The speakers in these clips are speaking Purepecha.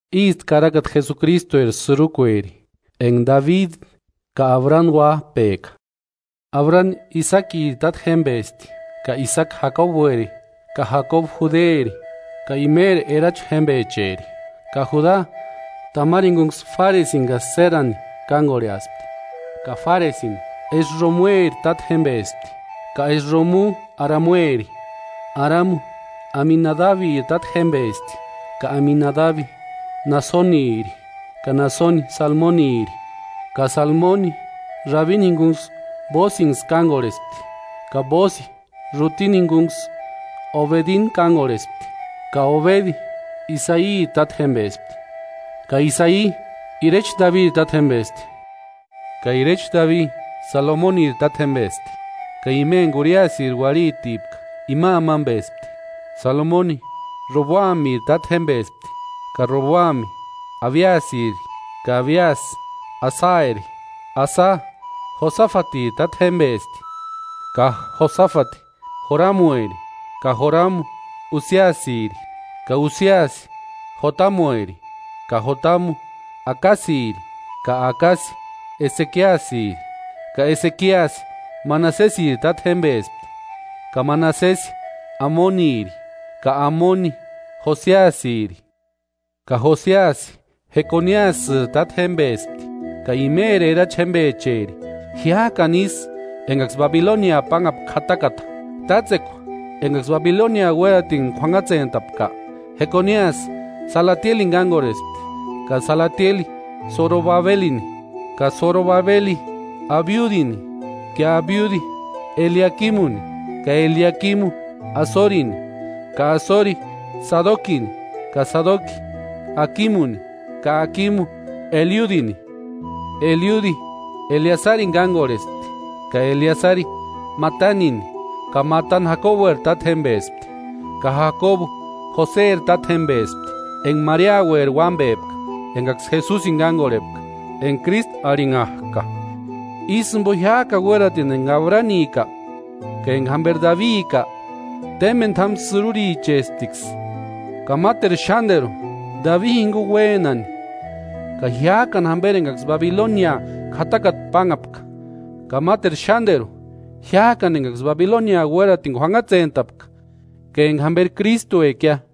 Ísti karakata Jesukristueri sïrukueri, enka Dabidi ka Abrani uáp'eka: Abrani Isakiri tátjempespti ka Isaki Jakobueri ka Jakobu Juderi, ka imeri erachi jémpecheri. Ka Juda Tamari jinkunksï Fáresini ka Sérani kánkorheaspti ka Fáresi Esromueri tátjempespti ka Esromu Aramueri. Aramu Aminadabiri tátjempespti ka Aminadabi Naasoniri ka Naasoni Salmoniri. Ka Salmoni Raabini jinkuni Bóosinksï kánkorhespti ka Bóosi Rútini jinkunksï Obedini kánkorhespti ka Obedi Isairi tátjempespti, ka Isai irecha Dabiri tátjempespti. Ka irecha Dabi Salomoniri tátjempespti ka ima enka Uriasiri uarhitipka ima amampespti. Salomoni Roboamiri tátjempespti ka Roboami Abiasiri ka Abiasi Asari. Asa Josafatiri tátjempespti ka Josafati Joramueri ka Joramu Usiasiri. Ka Usiasi Jotamueri ka Jotamu Akasiri ka Akasi Esekiasiri. Ka Esekiasi Manasesiri tátjempespti ka Manasesi Amoniri ka Amoni Josiasiri. Ka Josiasi Jekoniasïri tátjempespti ka imeri erachi jémpecheri, jiák'ani isï enkaksï Babilonia pánhapka k'atakata. Tátsekua enkaksï Babilonia uératini k'uanhatsentapka, Jekoniasï Salatielini kánkorhespti ka Salatieli Sorobabelini. Ka Sorobabeli Abiudini ka Abiudi Eliakimuni ka Eliakimu Asorini, ka Asori Sadokini ka Sadoki Akimuni ka Akimu Eliudini. Eliudi Eleasarini kánkorhespti ka Eleasari Matanini ka Matani Jakobueri tátjempespti, ka Jakobu Joseri tátjempespti, enka Mariaueri uámpepka enkaksï Jesusini kánkorhepka enka Krístu arhinhak'a. Ísï jimpo jiák'ani uératini enka Abranika ka enka jamperi Dabika témpeni t'ámu sïrurichesptiksï. Ka máteru xánteru Dabi jinkuni uénani ka jiák'ani jamperi enkaksï Babilonia k'atakata pánhapka, ka máteru xánteru jiák'ani enkaksï Babilonia uératini k'uanhatsentapka ka enka jamperi Krístuekia.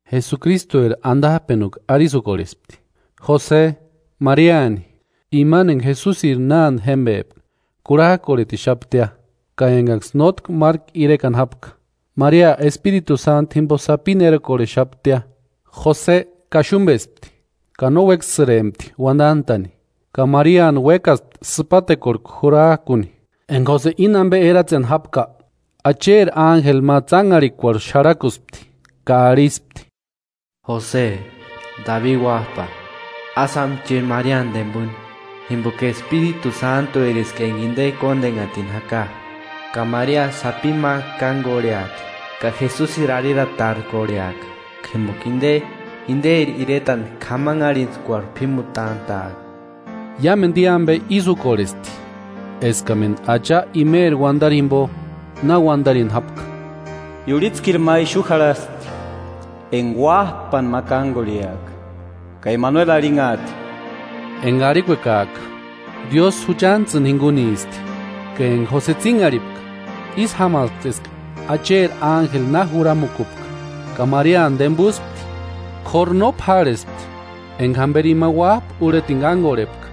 Jesukristueri antap'enukua arisï úkorhespti: Jose Mariani, imani enka Jesusiri nánte jémpeka kurhak'orhetixaptia, ka enkaksï nótki márku irekani jápka, Maria Espiritu Sántuni jimpo sapini erokorhexaptia. Jose kaxumpespti ka no uékasïrempti uantant'a'ni, ka Mariani uékaspti sïpatekuarhku jurak'uni. Enka Jose íni ampe eratseni jápka, Acheri ánjeli ma tsánharhikuarhu xarhakuspti ka arhispti: “Jose, Dabi uáp'a, ásï jáma chéni Mariani tempuni, jimpoka Espiritu Sántueriska enka inte kóntenhatini jaka. Ka Maria sapini ma kánkorheati ka Jesusiri arhiratarkorheaka jimpoka inte, interi iretani k'amanharhintskuarhu p'ímutant'a'aka.” Iámentu i ampe ísï úkorhesti eskamentu Acha imeri uantarini jimpo na uantarini jápka: “Iurhitskiri ma ixu jarhasti enka uáp'ani ma kánkorheaka, ka Emanueli arhinhaati.” (Enka arhikuekak'a: “Diósï juchantsïni jinkunisti”). Ka enka Jose tsínharhipka ísï jámaspti eska Acheri ánjeli na juramukupka ka Mariani tempuspti. K'óru no p'árhespti enka jamperi ima uáp'a urhetini kánkorhepka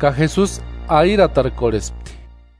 ka Jesusi arhiratarkorhespti.